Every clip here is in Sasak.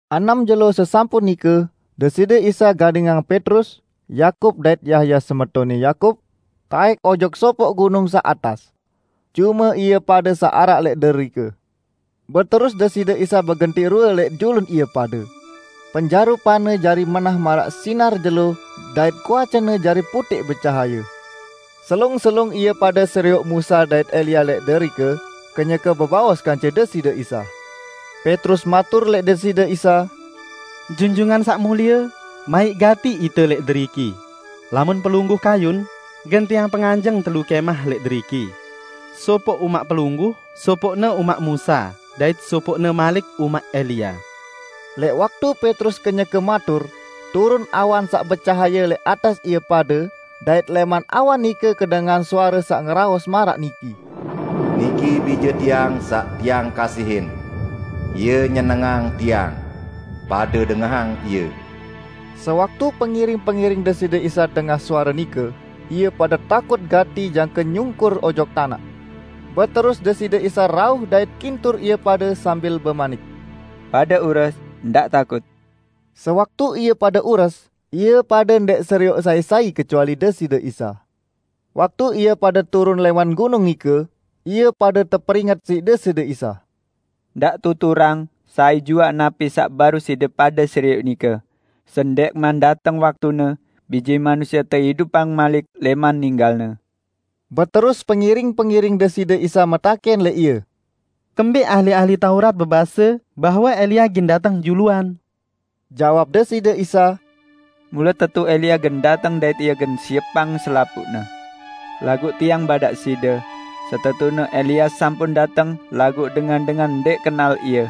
Enem jelo sesampun nike, Deside Isa gadingang Petrus, Yakub dait Yahya semetonne Yakub, taẽk ojok sopoq gunung saq atas. Cume ie pade saq araq lẽq derike. Beterus Deside Isa begentiq rue lẽq julun ie pade. Penjarupan-Ne jari menah maraq sinar jelo dait kuace-Ne jari putẽq becahaye. Selung-selung ie pade serioq Musa dait Elia lẽq derike kenyeke bebaos kance Deside Isa. Petrus matur lẽq Deside Isa, "Junjungan Saq Mulie, maiq gati ite lẽq deriki, lamun Pelungguh kayun, gen tiang penganjeng telu kẽmah lẽq deriki: Sopoq umaq Pelungguh, sopoqne umaq Musa dait sopoqne malik umaq Elia." Lẽq waktu Petrus kenyeke matur, turun awan saq becahaye lẽq atas ie pade dait lẽman awan nike kedengahan suare saq ngeraos maraq niki, "Niki Bije Tiang saq Tiang kasihin. Ie nyenengang Tiang. Pade dengahang Ie!" Sewaktu pengiring-pengiring Deside Isa dengah suare nike, ie pade takut gati jangke nyungkur ojok tanaq. Beterus Deside Isa rauh dait kintur ie pade sambil bemanik, "Pade ures, ndaq takut!" Sewaktu ie pade ures, ie pade ndẽq serioq sai-sai kecuali Deside Isa. Waktu ie pade turun lẽman gunung nike, ie pade teperinget siq Deside Isa, "Ndaq tuturang sai juaq napi saq baruq side pade serioq nike, sendẽqman dateng waktune Bije Manusie teidupang malik lẽman ninggal-Ne." Beterus pengiring-pengiring Deside Isa metakẽn lẽq Ie, "Kembẽq ahli-ahli Taurat bebase bahwe Elia gen dateng juluan?" Jawab Deside Isa, "Mule tetu Elia gen dateng dait ie gen siepang selapuqne. Laguq Tiang badaq side: Setetune Elia sampun dateng laguq dengan-dengan ndẽq kenal ie.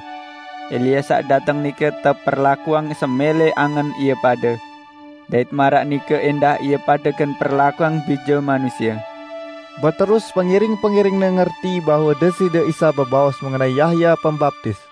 Elia saq dateng nike teperlakuang semẽlẽ angen ie pade. Dait maraq nike ẽndah ie pade gen perlakuang Bije Manusie." Beterus pengiring-pengiring-Ne ngerti bahwe Deside Isa bebaos mengenai Yahya Pembaptis.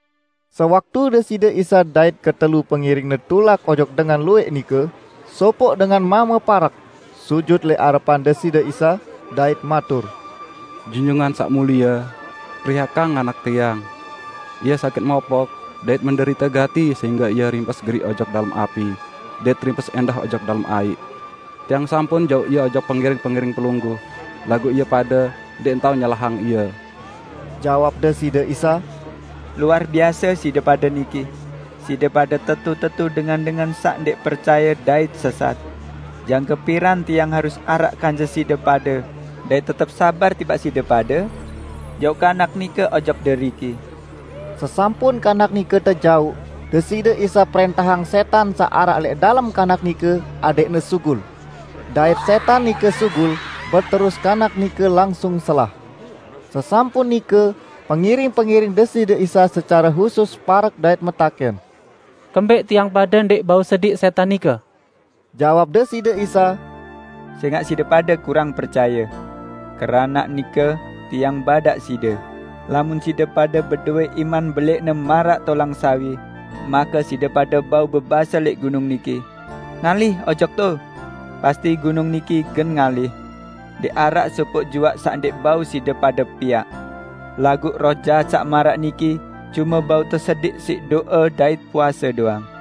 Sewaktu Deside Isa dait ketelu pengiring-Ne tulak ojok dengan luwẽq nike, sopoq dengan mame parek, sujut lẽq arepan Deside Isa, dait matur, "Junjungan Saq Mulie, periakang anak tiang. Ie sakit mopok, dait menderite gati sehingge ie rimpes geriq ojok dalem api dait rimpes ẽndah ojok dalem aiq. Tiang sampun jauq ie ojok pengiring-pengiring Pelungguh, laguq ie pade ndẽq tao nyelahang ie." Jawab Deside Isa, "Luar biase side pade niki! Side pade tetu-tetu dengan-dengan saq ndẽq percaye dait sesat! Jangke piran Tiang harus araq kance side pade dait tetep sabar tipaq side pade? Jauq kanak nike ojok deriki!" Sesampun kanak nike tejauq, Deside Isa prẽntahang sẽtan saq araq lẽq dalem kanak nike adẽqne sugul. Dait sẽtan nike sugul, beterus kanak nike langsung selah. Sesampun nike, pengiring-pengiring Deside Isa secare husus parek dait metakẽn, "Kembẽq tiang pade ndẽq bau sediq sẽtan nike?" Jawab Deside Isa, "Sẽngaq side pade kurang percaye. Keranaq nike Tiang badaq side: Lamun side pade bedowẽ iman belẽqne maraq tolang sawi, make side pade bau bebase lẽq gunung niki, 'Ngalih ojok to!' pasti gunung niki gen ngalih. Ndẽq araq sopoq juaq saq ndẽq bau side pade piaq! [ Laguq roh jahat saq maraq niki cume bau tesediq siq do'e dait puase doang.]"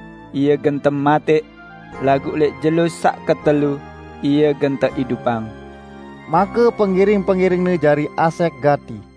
Ie gen tematẽq. Laguq lẽq jelo saq ketelu, Ie gen teidupang." Make pengiring-pengiring-Ne jari asẽq gati.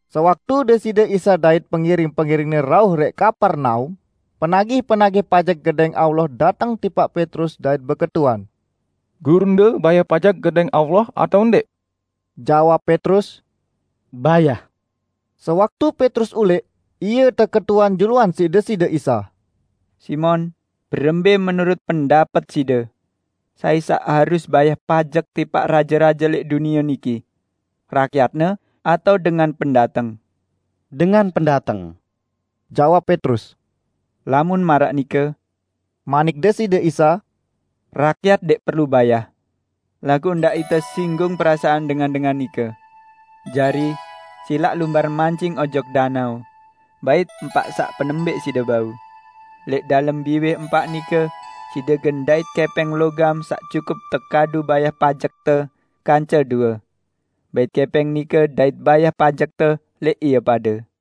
Sewaktu Deside Isa dait pengiring-pengiring-Ne rauh lẽq Kapernaum, penagih-penagih pajek Gedẽng Allah dateng tipaq Petrus dait beketuan, "Gurunde bayah pajek Gedẽng Allah atao ndẽq?" Jawab Petrus, "Bayah!" Sewaktu Petrus ulẽq, ie teketuan juluan siq Deside Isa, "Simon, berembẽ menurut pendapet side? Sai saq harus bayah pajek tipaq raje-raje lẽq dunie niki? Rakyatne atao dengan pendateng?" "Dengan pendateng," jawab Petrus. "Lamun maraq nike," manik Deside Isa, "rakyat ndẽq perlu bayah. Laguq ndaq ite singgung perasaan dengan-dengan nike. Jari, silaq lumbar mancing ojok danao. Bait empaq saq penembẽq side bau. Lẽq dalem biwih empaq nike side gen ndait kẽpẽng logam saq cukup tekadu bayah pajekte kance due. Bait kẽpẽng nike dait bayah pajekte lẽq ie pade."